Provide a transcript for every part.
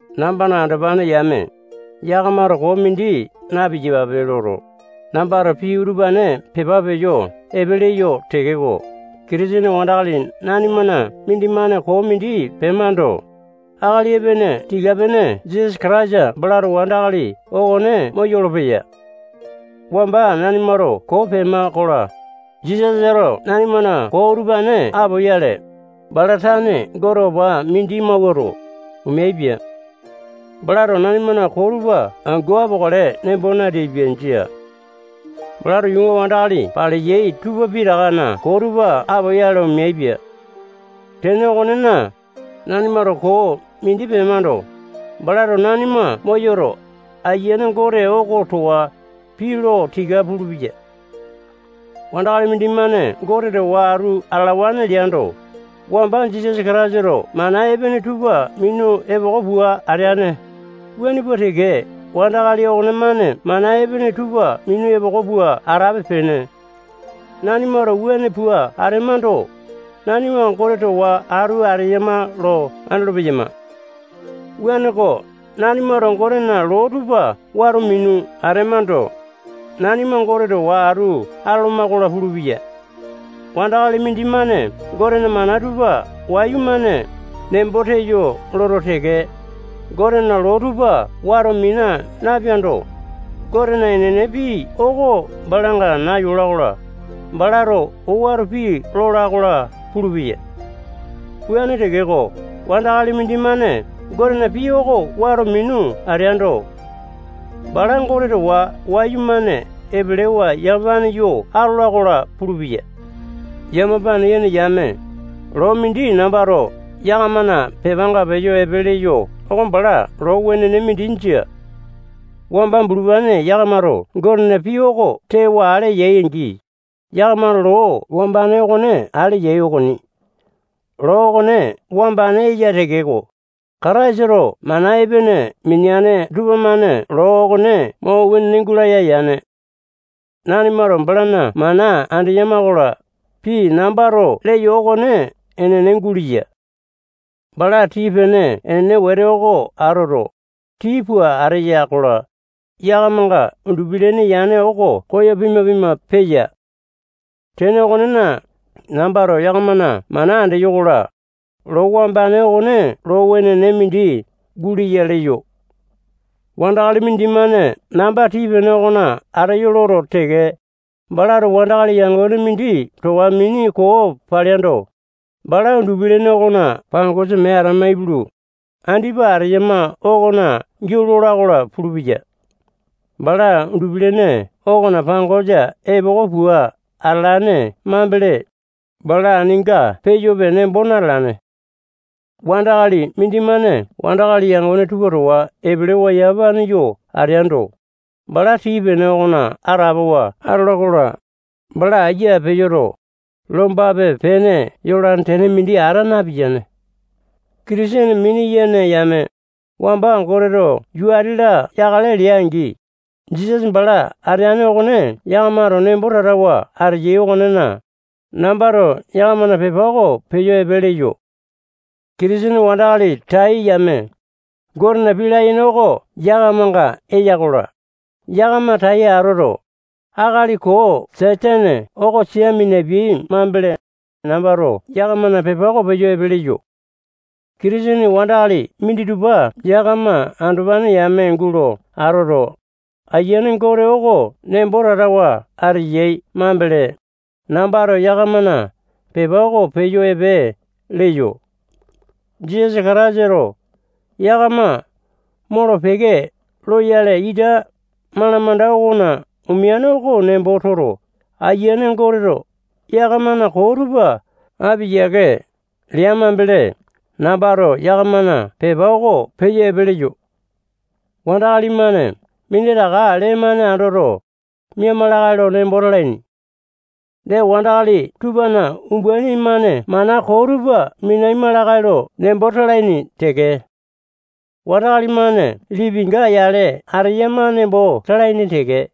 Nambana andopane yame, yakamato koo mindi na-piyapape loto, nambato pii utupane pepa peyo epe leyo tekeko, Kitisene wandakali nanimana mindimane koo mindi pemando, akali epene tika-pene Jisasa Kataisa balato wandakali okone moyolo-peya. Wamba nanimato koo pema-kola, Jisasato nanimana koo utupane apoyale, bala tane Gote opa mindi mawuato, omeaipia. Balato nanimana koo tupa angu apokale nembo nateaipia. Jia. Balato yuunga wandakali paleyai tupa pitakana koo tupa apoyale omeaipia. Tene okonena, nanimato koo mindi pemando, balato nanima moyoto, Ayiane Gote oko towa pii lo tika pulupeya. Wandakali mindimane Gote towa atu atalawane leando, wamba Jisasa Kataisato mana epene tupa minu epoko pua ateane, wuane pua teke wandakali okonemane mana epene tupa minu epoko pua atape-pene. Nanimato wuane pua atemando, nanima Gote towa atu ateyama lo andolo-peyama. Wuaneko, nanimato Gotena loo tupa wato minu atemando, nanima Gote towa atu atoloma-kola pulupeya. Wandakali mindimane Gotena mana tupa wayumane nembo teyo loto teke, Gotena loo tupa wato mina napeando, Gotena enene pii oko balanga nayola-kola, balato owato pii lola-kola pulupeya. Wuane tekeko, wandakali mindimane Gotena pii oko wato minu ateando, bala Gote towa wayumane epelewa yamapane yo atola-kola pulupeya. Yamapane yene yame, loo mindi nambato yakamana pepanga peyo epe leyo oko bala loo wenene mindi jia. Wamba bulupane yakamato Gotena pii oko tewa ale yai-angi, yakamato loo wambane okone ale yai okoni. Loo okone wambane eya tekeko, Kataisato mana epene mineane tupamane loo okone mo wenene gulaya yane. Nanimato balana mana andeyama-kola, pii nambato leyo okone enene guleya. Bala tii-pene enene wete oko atoto, tii pua ateya-kola, yakamanga undupi-lene yane oko koyo pima-pima peya. Tene okonena, nambato yakamana mana andeyo-kola, loo wambane okone loo wenene mindi guleya leyo. Wandakali mindimane namba tii-pene okona ateyo loto teke, balato wandakali yangone mindi towa mini koo paleando, bala undupi-lene okona pangosa mee atama ipulu, andipa ateyama okona giau lola-kola pulupeya. Bala undupi-lene okona pangosa epoko pua atalane mambele, bala aninga peyope nembo natalane. Wandakali mindimane wandakali yangone tupa towa epelewa yamapane yo ateando, bala tii-pene okona atapowa atola-kola, bala ayia peyoto, lombape-pene yolane tene mindi ata napiyane. Kitisene mini-yene yame, wamba Goteto yuu ati-la yakale lea-angi, Jisasa bala ateane okone yakamato nembo tatawa ateyai okonena, nambato yakamana pepa oko peyo epe leyo. Kitisene wandakali tai yame, Gotena pii layene oko yakamanga eya-kola, yakama tai atoto, akali koo Satane oko sia minapiai mambele, nambato yakamana pepa oko peyo epe leyo. Kitisene wandakali minditupa yakama andopane yame gulo atoto, Ayiane Gote oko nembo tatawa ateyai mambele, nambato yakamana pepa oko peyo epe leyo. Jisasa Kataisato yakama molo-peke loyale ita malamanda okona omeane oko nembo toto, Ayiane Goteto yakamana koo tupa api yiake mambele, nambato yakamana pepa oko peyo epe leyo. Wandakali-mane minditaka lee-mane andoto, miama lakae lo nembo talaini. Dee, wandakali tupana umbaini-mane mana koo tupa minaima lakae lo nembo talaini teke. Wandakali-mane lipinga yale ateyama nembo talaini teke.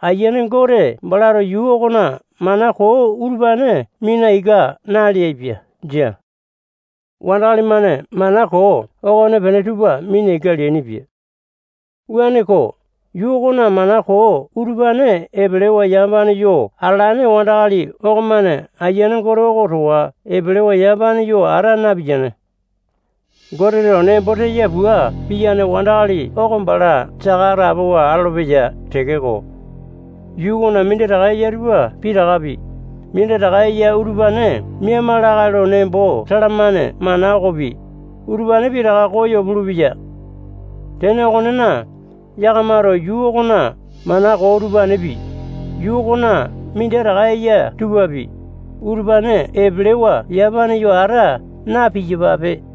Ayiane Gote balato yuu okona mana koo utupane mina ika naleaipia. Jia. wandakali-mane mana koo okonepene tupa mina ika leainipia. Wuaneko, yuu okona mana koo utupane epelewa yamapane yo atalane wandakali okomane Ayiane Gote oko towa epelewa yamapane yo ata napiyane. Goteto nembo teya pua piyane wandakali oko bala saka atapowa atolopeya tekeko, yuu okona minditaka eya tupa pitakapi, minditaka eya utupane miaima lakae lo nembo talamane mana okopi, utupane pitaka koyo pulupeya. Tene okonena, yakamato yuu okona mana koo utupanepi, yuu okona minditaka eya tupapi, utupane epelewa yamapane yo ata na-piyapape.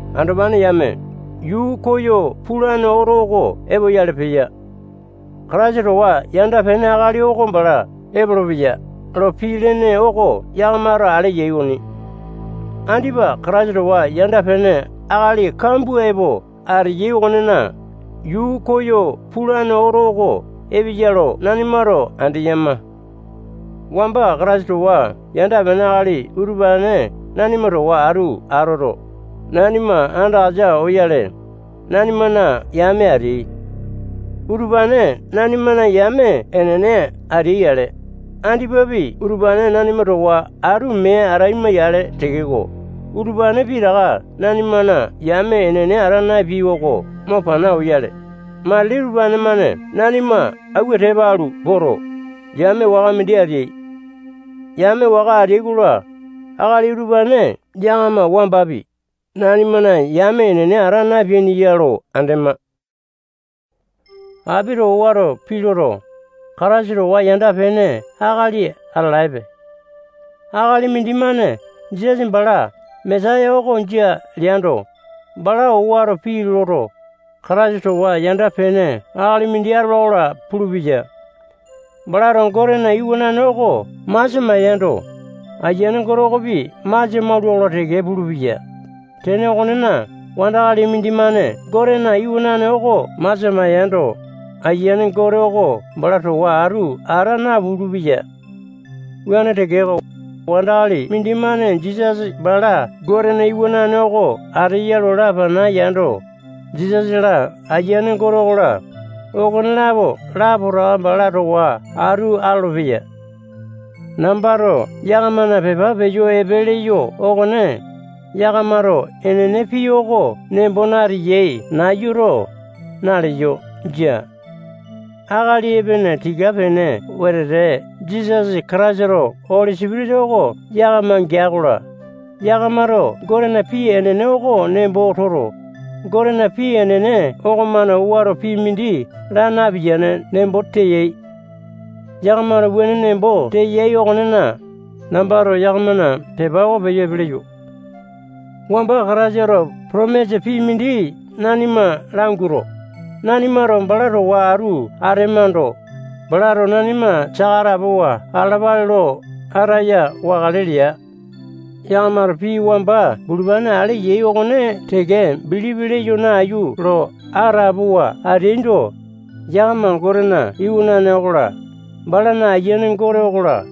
Andopane yame, yuu koyo pulane oto oko epoyale peya. Kataisa towa yanda-pene akali oko bala epolopeya lo pii lene oko yakamato ale yai okoni. Andipa Kataisa towa yanda-pene akali kambua epo ateyai okonena, yuu koyo pulane oto oko epeya lo nanimato andeyama. Wamba Kataisa towa yanda-pene akali utupane nanima towa atu atoto, nanima andakasa oyale, nanimana yame ateai. Utupane nanimana yame enene ateai-yale, andipapi utupane nanima towa atu mee ataima-yale tekeko, utupane pitaka nanimana yame enene ata napeai oko mo pana oyale, matili utupane-mane nanima awua tepa alu poto, yame waka mindi ateai. Yame waka ateai-kola, akali utupane yakama wambapi, nanimana yame enene ata napeaini ya lo andema. Apito owato pii loto, Kataisa towa yanda-pene akali atalaepe. Akali mindimane Jisasa bala Mesaya oko jia leando, bala owato pii loto, Kataisa towa yanda-pene akali mindi atolo-kola pulupeya. Balato Gotena Iwanane oko masia maiyando, Ayiane Gote okopi masia maula-kola teke pulupeya. Tene okonena, wandakali mindimane Gotena Iwanane oko masia maiyando, Ayiane Gote oko bala towa atu ata napulu-peya. Wuane tekeko, wandakali mindimane Jisasa bala Gotena Iwanane oko ateya lo lapana yando, Jisasa-la, Ayiane Gote okola, okonelapo lapotaka bala towa atu atolopeya. Nambato yakamana pepa peyo epe leyo okone, yakamato enene pii oko nembo nateyai nayuto, naleyo. Jia. Akali epene tika-pene wetete Jisasa Kataisato Oli Sipitisa oko yakama gea-kola, yakamato Gotena pii enene oko nembo toto, Gotena pii enene okomane owato pii mindi laa napiyane nembo teyai. Yakamato wuane nembo teyai okonena, nambato yakamana pepa oko peyo epe leyo. Wamba Kataisato potomisa pii mindi nanima languato, nanimato bala towa atu atemando, balato nanima saka atapowa atalapale lo ataya wakale lea. Yakamato pii wamba bulupane ale yai okone teke bilipi leyo nayu lo atapowa ateaindo, yakama Gotena Iwanane okola, balana Ayiane Gote okola,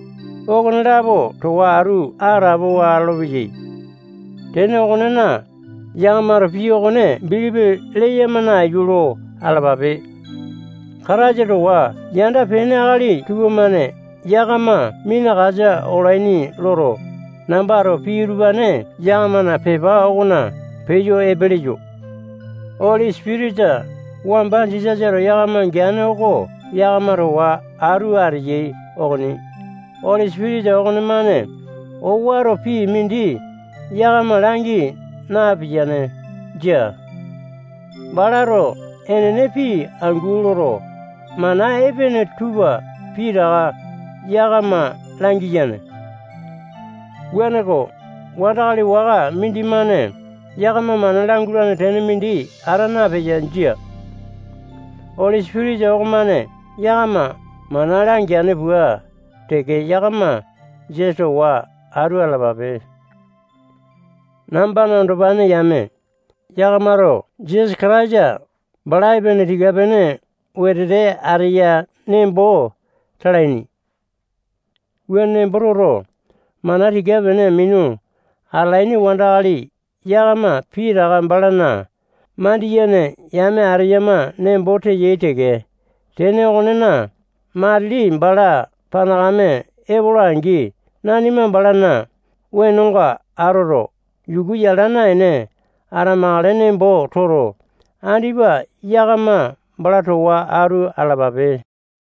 okonelapo towa atu atapowa atolopeyai. Tene okonena, yakamato pii okone bilipi leyama nayu lo atalapape. Kataisa towa yanda-pene akali tupamane yakama minakasa olaini loto, nambato pii utupane yakamana pepa okona peyo epe leyo. Oli Sipitisa wamba Jisasato yakama geane oko yakama towa atu ateyai okoni. Oli Sipitisa okonemane owato pii mindi yakama langi napiyane. Jia. Balato enene pii angu loto, mana epene tupa pitaka yakama langiyane. Wuaneko, wandakali waka mindimane yakama mana langualane tene mindi ata napeya. Jia. Oli Sipitisa okomane yakama mana langeane pua teke, yakama Jisasa towa atu atalapape. Nambana andopane yame, yakamato Jisasa Kataisa bala epene tika-pene wetete ateya nembo talaini. Wuane nembo toto, mana tika-pene minu atalaini wandakali yakama pitaka balana mandiyene yame ateyama nembo teyai teke. Tene okonena, matili bala panakame epola-angi, nanima balana wenonga atoto, yukuwa yala naene atamakale nembo toto, andipa yakama bala towa atu atalapape.